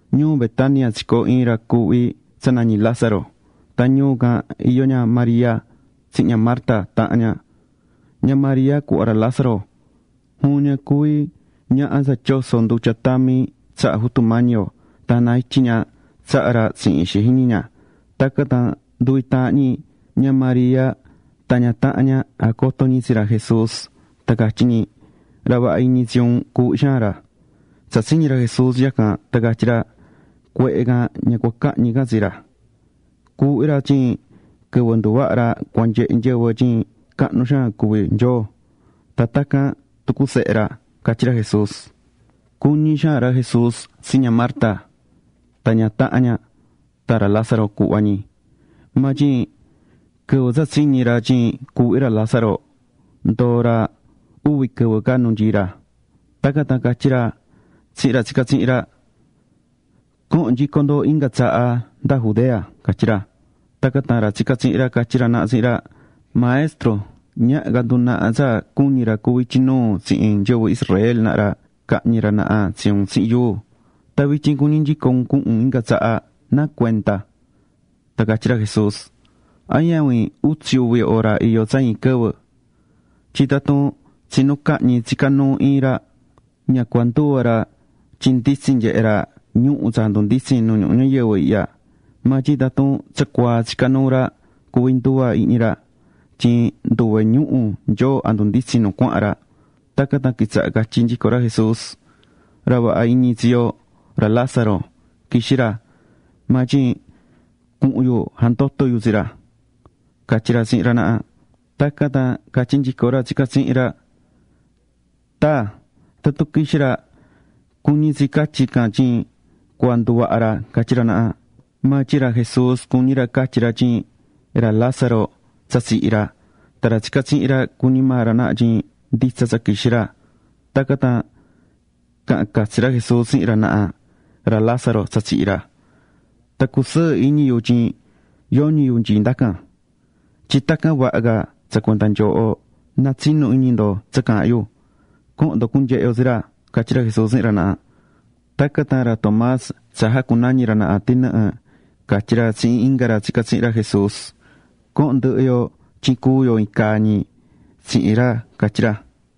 Ñuu Betania tsicoo̱ iin ra cuuhvi tsa nañí Lázaro. Tan ñuu can iyó ña María tsihin ña Marta tahan ña. Ña María, cuhva ra Lázaro, juvin ña cuví ñaha tsa tyoso̱ ndutya tami tsaha Jutu Mañi yo, tan jana ityi̱ ña tsaha ra tsihin ixi jiñi ña. Tacan tan nduvi taahan ñi, ña María tan ña tahan ña, jacoto̱ ñi tsi ra Jesús tan catyí ñi: ―Ra vaha iñi tsi un, cuuhví xaan ra. Tsa tsiñi̱ ra Jesús yacan tan catyí ra: ―Cuehe can ña cua cahñi can tsi ra. Cuuhví ra tyin quɨvɨ nduvaha ra cua nyehe nyɨvɨ tyin cahnu xaan cuví Nyoo tan tacan tucu Sehe ra ―catyí ra Jesús. Cuñí xaan ra Jesús tsi ña Marta tan ña tahan ña, tan ra Lázaro cuhva ñi. Maa tyin quɨvɨ tsa tsiñi̱ ra tyin cuuhví ra Lázaro, ndoo̱ ra uvi quɨvɨ ca nu nyií ra. Tacan tan catyí ra tsihin ra tsicá tsihin ra: ―Cohon nyico ndo inga tsaha nda Judea ―catyí ra. Tacan tan ra tsicá tsihin ra catyí ra naha tsihin ra: ―Maestro, ñaha ca ndunaha tsa cuñi̱ ra cuví ityi nuu tsihin nyɨvɨ Israel naha ra cahñi ra naha tsi un tsihin yuu. Tan vityin, cuñí nyico un cuhun un inga tsaha ¿Nacuenda? Tan catyí ra Jesús: ―¿A ñavin utsi uvi hora iyó tsa iin quɨvɨ? Tyin tatun tsinu cahñi tsicá nuu iin ra, ña cua nduva ra tyin nditsin nyehé ra ñuhu̱ tsa jandunditsín nu ñuhu ñayɨvɨ ihya. Maa tyin tatun tsacuaa tsicá nuu ra, cuvi nduva ihñi ra tyin nduve ñuhu̱ Nyoo jandunditsín nu cuahan ra. Tacan tan quitsaha̱ catyí nyico ra Jesús: ―Ra vaha iñi tsi yo, ra Lázaro, quixí ra. Maa tyin cuhun yu jandoto yu tsi ra ―catyí ra tsihin ra naha. Tacan tan catyí nyico ra tsicá tsihin ra: ―Taa, tatun quixí ra, cuñí tsi catyí can tyin cua nduvaha ra ―catyí ra naha. Maa tyin ra Jesús cuñí ra catyi ra tyin ra Lázaro tsa tsihi̱ ra. Tan ra tsicá tsihin ra, cuñí maa ra naha tyin nditsa tsa quixí ra. Tacan tan caha̱n catsi ra Jesús tsihin ra naha: ―Ra Lázaro tsa tsihi̱ ra. Tan cusɨɨ́ iñi yu tyin yoñi yu nyií ndacan. Tyin tacan vaha ca tsa cuenda nyooho na tsinu iñi ndo tsa caahán yu. Co̱hon ndo cunyehe yo tsi ra ―catyí ra Jesús tsihin ra naha. Tacan tan ra Tomás, tsa jacunañi̱ ra naha “tɨnɨhɨ”, catyí ra tsihin inga ra tsicá tsihin ra Jesús: ―Co̱hon ndɨhɨ yo tyin cúu yo iin caa ñi tsihin ra ―catyí ra.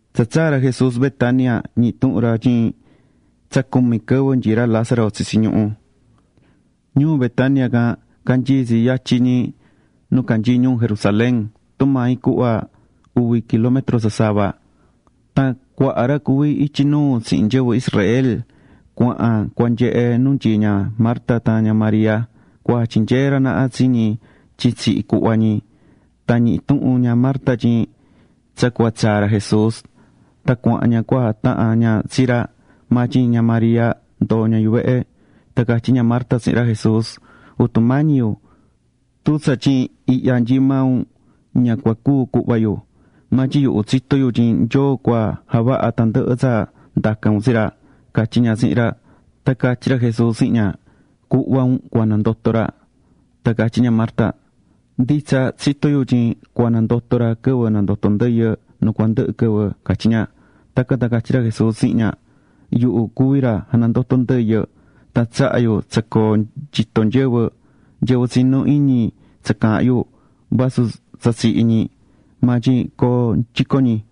Tsa tsaa̱ ra Jesús Betania, ñihi̱ tuhun ra tyin tsa cumi quɨvɨ nyií ra Lázaro tsitsi ñuhú. Ñuu Betania can canyií tsi yatyin ñi nu canyií ñuu Jerusalén, tumaa iin cuhva tsa uvi kilómetro sasava. Tan cuaha ra cuví ityi nuu tsihin nyɨvɨ Israel cuahan cua nyehe nu nyií ña Marta tan ña María cua jatyinyee ra naha tsi ñi tyin tsihi̱ cuhva ñi. Tan ñihi̱ tuhun ña Marta tyin tsa cua tsaa ra Jesús. Tan cuahán ña cua jatahan ña tsi ra. Maa tyin ña María ndoo̱ ña yuvehe. Tan catyí ña Marta tsihin ra Jesús: ―Jutu mañí yu, tun tsatyin ihya nyii̱ maa un, ña cua cúu cuhva yu. Maa tyin yuhu tsitó yu tyin Nyoo cua javaha ra tandɨhɨ tsa ndacan un tsi ra ―catyí ña tsihin ra. Tan catyí ra Jesús tsihin ña: ―Cuhva un cua nandoto ra. Tan catyí ña Marta: ―Nditsa, tsitó yu tyin cua nandoto ra quɨvɨ nandoto ndɨyɨ nu cua cundɨhɨ quɨvɨ ―catyí ña. Tacan tan catyí ra Jesús tsihin ña: ―Yuhu cuví ra janandotó ndɨyɨ. Tan tsahá yu tsa coo nyitó nyɨvɨ. Nyɨvɨ tsinú iñi tsa caahán yu, vasu tsa tsihi̱ ñi maa tyin coo nyico ñi.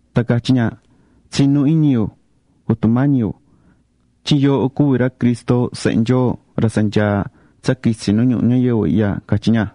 Tan catyí ña: ―Tsinú iñi yu, Jutu Mañi yu, tyin yooho cuví ra Cristo Sehe Nyoo, ra tsa nyaá tsa quitsi nu ñuhu ñayɨvɨ ihya ―catyí ña.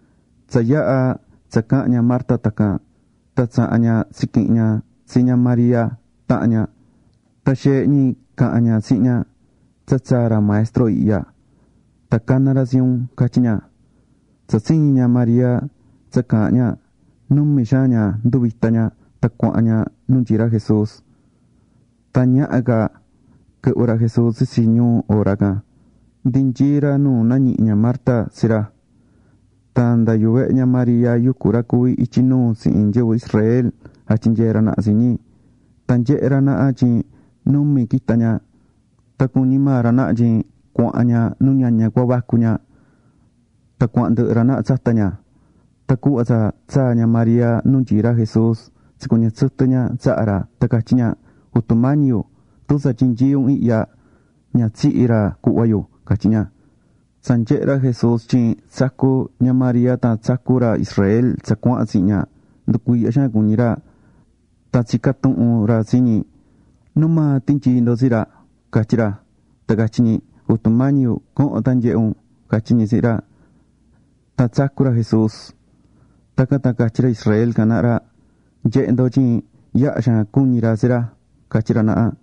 Tsa yaha̱ tsa caha̱n ña Marta tacan, tan tsaha̱n ña tsiquihi̱n ña tsi ña María tahan ña, tan xeehe ñi caha̱n ña tsihin ña: ―Tsa tsaa̱ Ra Maestro ihya. Tan caná ra tsi un ―catyí ña. Tsa tsiñi̱ ña María tsa caahán ña, numi xaan ña nduvita̱ ña, tan cuahán ña nu nyií ra Jesús. Tan ñaha ca quɨhvɨ ra Jesús tsitsi ñuu hora can, ndi nyií ra nu nañihi̱ ña Marta tsi ra. Tan nda yuvehe ña María, yucú ra cuví ityi nuu tsihin nyɨvɨ Israel jatyinyeé ra naha tsi ñi. Tan nyehe̱ ra naha tyin numi quita̱ ña. Tan cuñí maa ra naha tyin cuahán ña nu ñaña cua vacu ña. Tan cuahán ndɨhɨ ra naha tsata ña. Tan cuhva tsa tsaa̱ ña María nu nyií ra Jesús tsicuɨñɨ̱ tsɨtɨ ña tsaha ra, tan catyí ña: ―Jutu Mañi yu, tun tsatyin nyií un ihya, ña tsihi̱ ra cuhva yu ―catyí ña. Tsa nyehe̱ ra Jesús tyin tsacú ña María tan tsacú ra Israel tsa cuahan tsihin ña, nducuiihya xaan cuñí ra. Tan tsica̱ tuhun ra tsi ñi: ―¿Nu maa tinyii̱ ndo tsi ra? ―catyí ra. Tan catyí ñi: ―Jutu Mañi yu, co̱hon tan nye̱he un ―catyí ñi tsihin ra. Tan tsacu̱ ra Jesús. Tacan tan catyí ra Israel can naha ra: ―Nye̱he ndo tyin yaha̱ xaan cuñi̱ ra tsi ra ―catyí ra naha.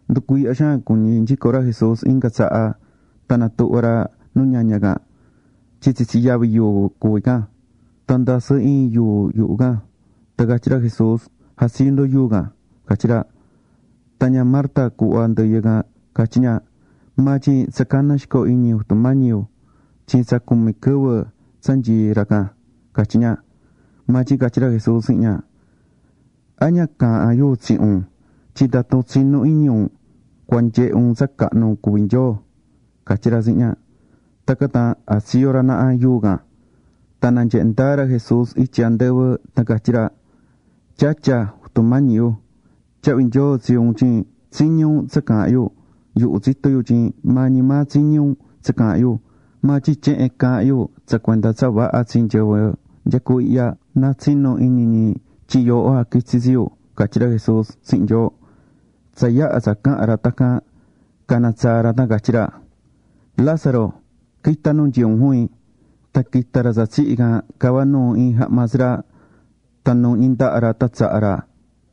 Nducuiihya xaan cuñí nyico ra Jesús inga tsaha tan natuhva̱ ra nu ñaña can. Tyin tsitsi yavi yuu cuví can. Tan ndasɨ́ iin yuu yuhu can. Tan catyí ra Jesús: ―Ja̱tsiyo ndo yuu can ―catyí ra. Tan ña Marta, cuhva ndɨyɨ can, catyí ña: ―Maa tyin tsa caná xico iñi, Jutu Mañi yu, tyin tsa cumi quɨvɨ tsa nyií ra ican ―catyí ña. Maa tyin catyí ra Jesús tsihin ña: ―¿A ña caahán yu tsihin un tyin tatun tsinú iñi un, cua nyehe un tsa cahnu cuví Nyoo? ―catyí ra tsihin ña. Tacan tan jatsiyo̱ ra naha yuu can. Tan nanyehe̱ ndaa ra Jesús ityi andɨvɨ, tan catyí ra: ―Tyatya, Jutu Mañi yu, tyahvi nyoo tsi un tyin tsiñi̱ un tsa caahán yu. Yuhu tsitó yu tyin maa ñi maa tsiñí un tsa caahán yu. Maa tyin tyehen caahán yu tsa cuenda tsa vaha tsi nyɨvɨ nyecú ihya, na tsinu iñi ñi tyin maa un jaquitsi̱ tsi yu ―catyí ra Jesús tsihin Nyoo. Tsa yaha̱ tsa caha̱n ra tacan, cana̱ tsaa ra, tan catyí ra: ―¡Lázaro, qui̱ta nu nyií un juvin! Tan quita̱ ra tsa tsihi̱ can, cavá nuu iin jahma tsi ra, tan nuuhñi ndaha ra tan tsaha ra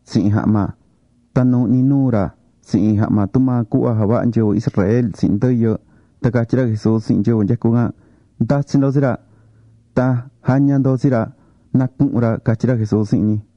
tsihin jahma. Tan nuuhñí nuu ra tsihin iin jahma tumaa javahá nyɨvɨ Israel tsihin ndɨyɨ. Tan catyí ra Jesús tsihin nyɨvɨ nyecú ican: ―Nda̱tsi ndo tsi ra. Tan ja̱ña ndo tsi ra na cuhun ra ―catyí ra Jesús tsihin ñi.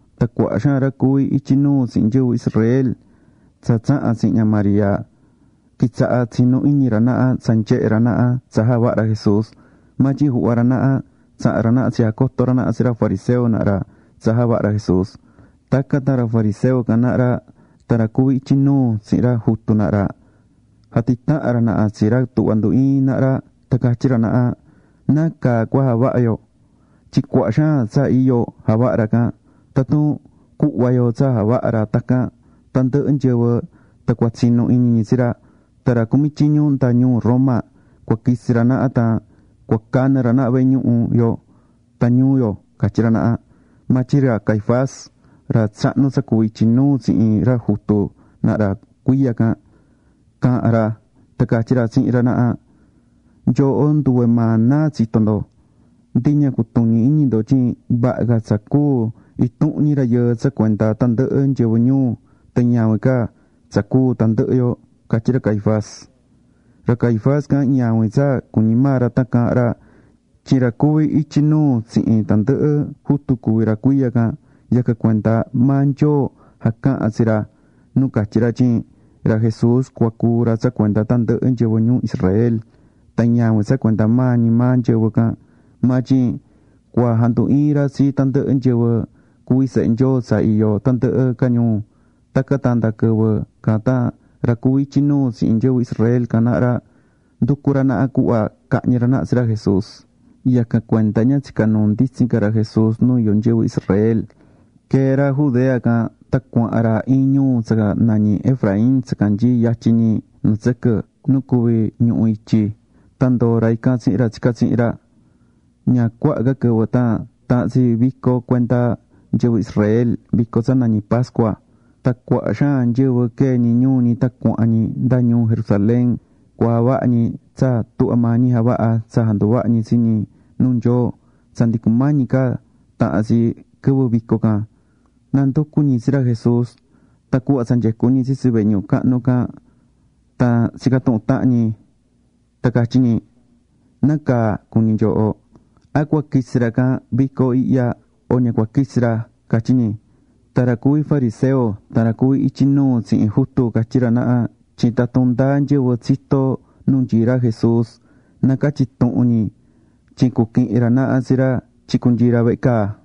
Tan cuaha xaan ra cuví ityi nuu tsihin nyɨvɨ Israel tsa tsaha̱n tsihin ña María quitsaha̱ tsinú iñi ra naha tsa nyehe̱ ra naha tsa javaha̱ ra Jesús. Maa tyin juhva ra naha tsaha̱n ra naha tsijacoto̱ ra naha tsi ra fariseo naha ra tsa javaha̱ ra Jesús. Tacan tan ra fariseo can naha ra tan ra cuví ityi nuu tsihin ra jutu naha ra jatitaha̱n ra naha tsi ra tuhvá ndu iín naha ra tan catyí ra naha: ―¿Nacaa cua javaha yo? Tyin cuaha xaan tsa iyo javahá ra can. Tatun cuhva yo tsa javaha ca ra tacan, tandɨhɨ nyɨvɨ tan cua tsinu iñi ñi tsi ra. Tan ra cumí tyiñu nda ñuu Roma cua quitsi ra naha tan cua canɨ ra naha vehe ñuhu yo tan ñuu yo ―catyí ra naha. Maa tyin ra Caifás ra tsahnu tsa cuví ityi nuu tsihin ra jutu naha ra cuiya can, caha̱n ra tan catyí ra tsihin ra naha: ―Nyooho nduve maa náa tsitó ndo. Ndi ña cutuñí iñi ndo tyin vaha ca tsa cúu intuhun ñi rayɨɨ tsa cuenda tandɨhɨ nyɨvɨ ñuu, tan ñavin ca tsa cúu tandɨhɨ yo ―catyí ra Caifás. Ra Caifás can ñavin tsa cuñí maa ra tan caahán ra, tyin ra cuví ityi nuu tsihin tandɨhɨ jutu cuví ra cuiya can, yacan cuenda maa Nyoo jacaha̱n tsi ra nu catyi̱ ra tyin ra Jesús cua cúu ra tsa cuenda tandɨhɨ nyɨvɨ ñuu Israel. Tan ñavin tsa cuenda maa ñi maa nyɨvɨ can, maa tyin cua jandu iin ra tsi tandɨhɨ nyɨvɨ cuví sehe Nyoo tsa iyó tandɨhɨ ca ñuu. Tacan tan nda quɨvɨ can tan ra cuví ityi nuu tsihin nyɨvɨ Israel can naha ra, nducú ra naha cuhva cahñi ra naha tsi ra Jesús. Yacan cuenda ña tsicá nuu nditsin ca ra Jesús nu iyó nyɨvɨ Israel. Quee̱ ra Judea can. Tan cuahán ra iin ñuu tsa nañí Efraín tsa canyií yatyin ñi nu tsɨquɨ, nu cuví ñuhu ityi. Tan ndoó ra ican tsihin ra tsicá tsihin ra. Ña cuaha ca quɨvɨ tan tahan tsi vico cuenda nyɨvɨ Israel, vico tsa nañí pascua. Tan cuaha xaan nyɨvɨ quee̱ ñi ñuu ñi tan cuahán ñi nda ñuu Jerusalén cua javaha ñi tsa tuhvá maa ñi javahá tsa janduvahá ñi tsi ñi nuu Nyoo tsa ndi cumañi ca tahan tsi quɨvɨ vico can. Nanducú ñi tsi ra Jesús. Tan cuhva tsa nyecú ñi tsitsi vehe ñuhu cahnu can tan tsicá tuhun tahan ñi, tan catyí ñi: ―¿Nacaa cuñí nyooho? ¿A cua quitsi ra can vico ihya, o ña cua quitsi ra? ―catyí ñi. Tan ra cuví fariseo tan ra cuví ityi nuu tsihin jutu, catyí ra naha tyin tatun ndáa nyɨvɨ tsitó nu nyií ra Jesús, na ca̱tyi tuhun ñi. Tyin cuquihin ra naha tsi ra tyin cunyii ra vehe caa.